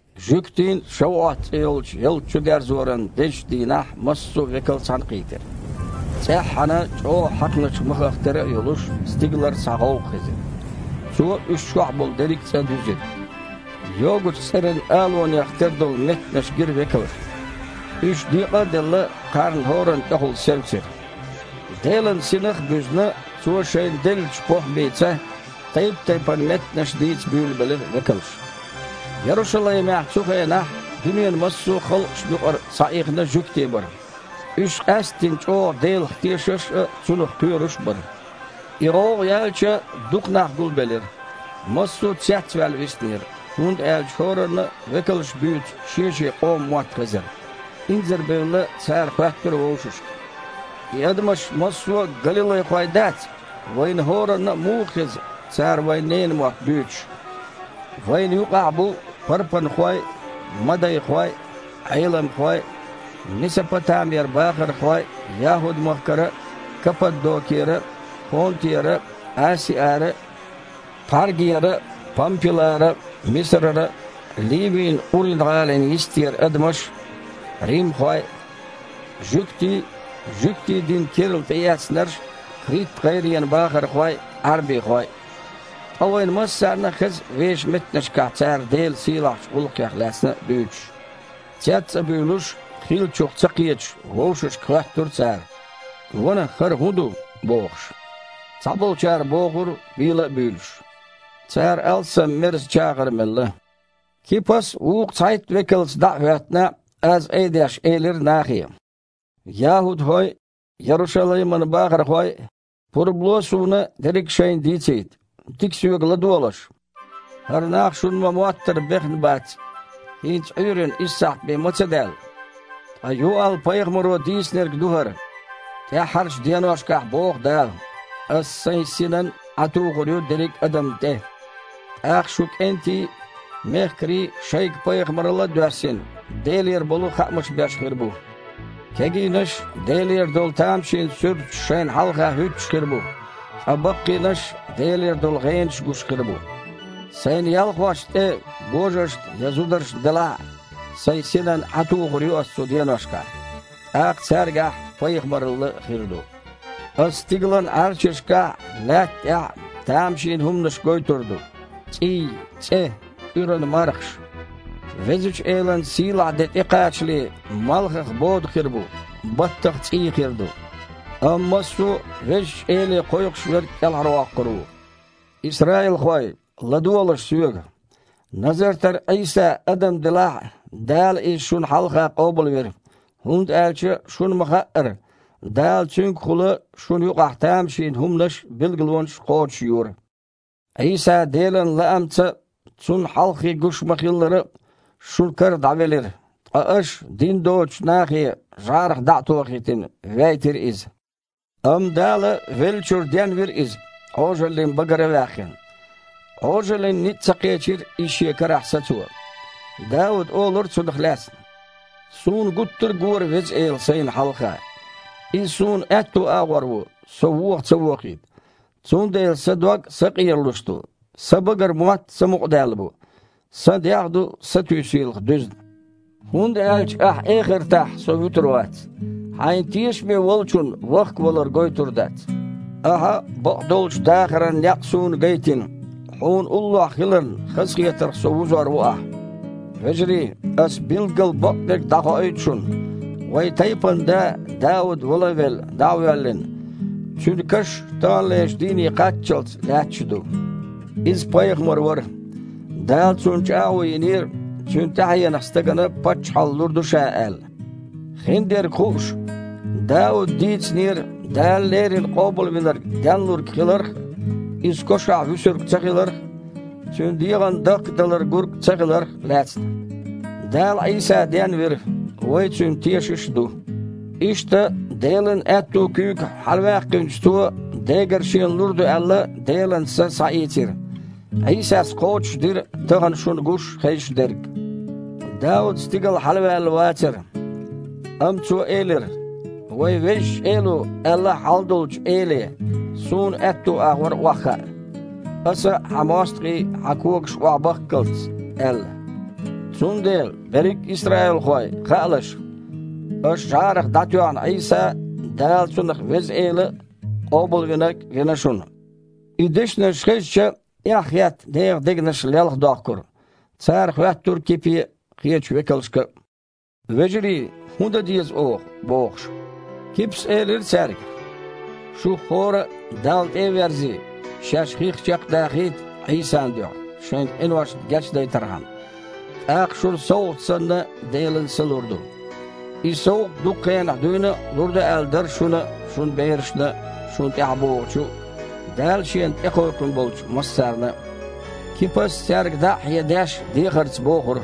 Жуьгтийн « ШавуІот» цІе йолчу ялта чудерзоран дезачу дийнахь массо а векал цхьаьнакхийтира. ЦІеххьана, чІогІа хьаькхначу махах тера а йолуш, стигалара цхьа гІовгІа хезира. Цо уьш чохь болу дерриг а цІа дуьзира. Йогучу цІеран алунех тера долу меттанаш гира векалшна. Уьш, декъа а делла, кхарна хІоранна тІехула севцира. Делан Синах а буьзна, Цо шайна деллачу похІмица тайп-тайпана меттанаш дийца буьйлабелира векалш. Ярушалаймехь цу хенахь дуьненан массо а халкъашна юкъара схьаихна жуьгтий бара. Уьш къаьсттина чІогІа Делах тешаш а, Цунах кхоьруш а бара. И гІовгІа яьлча, дукха нах гулбелира. Массо а цецваьлла виснера, хІунда аьлча хІоранна а векалша буьйцу шен-шен къоман мотт хезара. Инзарбевлла, цара хоьттура вовшашка: «И адамаш массо а галилайхой дац? Вайна хІоранна а муха хеза, цара вайн ненан мотт буьйцуш? Вайна юкъахь бу парпанхой а, мадайхой а, Іейламхой а, Месопатамера бахархой а, ЯхІуд-махкара а, Каппадокера а, Понтера а, Асиара а, Пхьаргера а, Пампилара а, Мисарара а, Ливин Къурина-гІалин йистера адамаш а, римхой а, (жуьгтий а, жуьгтийн дин керла тІеэцнарш а), Крит-гІайренан бахархой а, Іаьрбихой а. Ткъа вайна массарна а хеза вешан меттанашкахь цара Делан сийлахьчу гІуллакхех лаьцна дуьйцуш!» Цец а буьйлуш, хиллачух ца кхеташ, вовшашка хоьттура цара: «Ванах, хІара хІун ду?» – бохуш. Цхьаболчара бохура, бийла а буьйлуш: «Цара алсам мерза чагІар мелла». Кипас, вукху цхьайтта векалца дІа а хІоьттина, аз айдеш, элира нахе: «ЯхІудхой а, Ярушалайман бахархой а! Пурба ло суна дерриг а шайна дийцийта. Дика соьга ладогІалаш! ХІара нах, шуна ма-моттара, бехна бац, хІинца Іуьйранна исс сахьт бен ма ца даьлла. Ткъа Юал-пайхамаро дийцинарг ду хІара. „ТІаьххьарчу деношкахь, – боху Дала, – Аса Сайн Синан Іаь тухур ю дерриг а адамна тІе. ТІаккха шун кІентий а, мехкарий а, шайга пайхамаралла а доьссина, Делера болу хаамаш беш хир бу. Кегийнаш Делера долу тамашийна суьрташ шайна хьалха хІуьттуш хир бу, ткъа баккхийнаш Делера долу гІенаш гуш хир бу. Сайн ялхошна тІе, божаршна я зударшна делахь а, Сайн Синан Іаь тухур ю Аса цу деношкахь, тІаккха цаьргахь пайхамаралла хир ду. Аса стигалан Іаьрчашкахь а, лаьтта тІехь а тамашийна хІуманаш гойтур ду: цІий, цІе, кІуьран мархаш. Везачу Элан сийлахь де тІекхачале малхах бода хир бу, баттах цІий хир ду. Амма массо а Везачу Эле кхойкхуш верг кІелхьарвоккхур ву“. Исраилхой, ладогІалаш соьга: Назартара Іийса адам делахь а, Дала Иза шуна хьалха къобалвира. ХІунда аьлча шуна ма-хаъара, Дала Цуьнгахула шуна юкъахь тамашийна хІуманаш а, билгалонаш а кхочушйора. Іийса Делан лаамца а, Цунна хьалххе гуш ма-хиллара а, шун кара дІавелира, ткъа аша дин доцучу нахе, жІарах дІа а тохийтина, вейтира Иза. Амма Дала веллачуьра денвира Иза, Іожаллин багара а ваьккхина. Іожаллин ницкъ ца кхечира Иза шен карахь сацо. Дауда олура Цунах лаьцна: „Суна гуттар а гора Веза Эла сайна хьалха. Иза суна аьтту агІор ву, со воха ца вохийта. Цундела сан дог а сакъералуш ду, сан багара мотт а самукъадаьлла бу. Сан дегІ а ду сатуьйсийлах дуьзна. ХІунда аьлча Ахь эхартахь со вуьтур вац. Хьайна тешаме волчунна вахкавалар гойтур дац. Ахьа бакъдолчу дахаран некъ суна гайтина, Хьуна уллохь хиларна хазахетарх со вузор ву Ахь“. Вежарий, аса билггала бакъдерг дІахоуьйту шуна: вайн тайпанан да Дауд вала а велла, дІа а воьллина. Цуьнан каш таханлерчу дийне кхаччалц лаьтташ а ду. Иза пайхамар вара. Дала цунна чІагІо йинера, цуьнан тІаьхьенах стагана паччахьалла лур ду Ша аьлла. Хиндерг хууш, Дауда дийцинера Дала леррина Къобалвинарг денлург хиларх а, Иза кошахь вуьсург ца хиларх а, Цуьнан дегІана дахкадалар гург ца хиларх а лаьцна. Дала Іийса денвира, вай Цуьнан тешаш а ду. Иштта Делан аьтту куьйга хьалаваьккхинчу Цо Дегара Шена лур ду аьлла Делан Са схьаийцира. Іийсас кхочушдира тахана шуна гуш а, хезаш а дерг. Дауд стигала хьалаваьлла вацара, амма цо элира: „Вайн Везачу Эло аьлла Хьалдолчу Эле: ‘Суна аьтту агІор охьахаа, Аса Хьан мостагІий Хьан когашка охьабахккалц’, – аьлла“. Цундела, берриг а исраилхой, хаалаш: аша жІарах дІатоьхна Іийса – Дала Цунах Веза Эла а, Къобалвинарг а вина шуна». И дешнаш хезча, эхь хетта, нехан дегнаш лелхадохкура. Цара хоьттура Кипе а, кхечу векалшка а: «Вежарий, хІун дан деза оха?» – бохуш. Кипас элира цаьрга: «Шух хІора а Далла тІе а верзий, шаьш хих чекхдахийта Іийсан дуьхьа, шайн къиношна гечдайтархьама. ТІаккха шуна совгІат санна Делан Са лур ду. И совгІат дукха хенахь дуьйна а лур ду аьлла дара шуна а, шун берашна а, шуна тІаьхьабогІучу, Дала Шена тІекхойкхун болчу массарна а». Кипас, цаьрга дІа а хьедеш, дехарца бохура: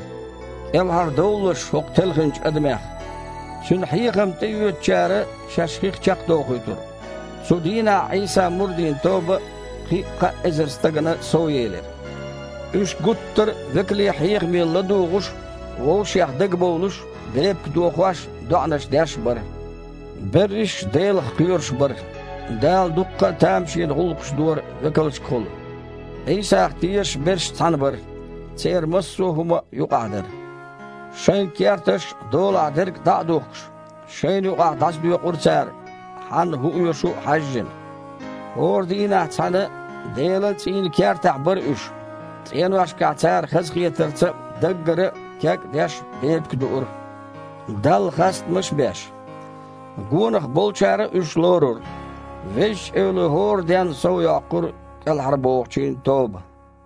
«КІелхьардовлалаш хІокху телхинчу адамех». Цуьнан хьехам тІеоьцучара шаьш хих чекхдохуьйтура. Цу дийнахь Іийсан мурдийн тоба кхин кхаа эзар стагана совъелира. Уьш гуттар а векалийн хьехаме ладугІуш а, вовшех дагабовлуш а, бепиг дохош а, доІанаш деш а бара. Берриш а Делах кхоьруш бара. Дала дуккха а тамашийна гІуллакхаш дора векалшкахула. Іийсах тешаш берш цхьаьна бара, церан массо а хІума юкъахь дара. Шайн керташ а, долахь дерг а дІа а духкуш, шайна юкъахь дІасадоькъура цара, хьанна хІун оьшу хьаьжжина. ХІора дийнахь цхьаьна Делан цІийнан кертахь бара уьш. ЦІеношкахь цара хазахетарца а, даггара а, кег а деш, бепиг дуура, Далла хастамаш а беш. Гонах болчара а уьш лорура. Везачу Эло хІора денна совйоккхура кІелхьарбохучийн тоба.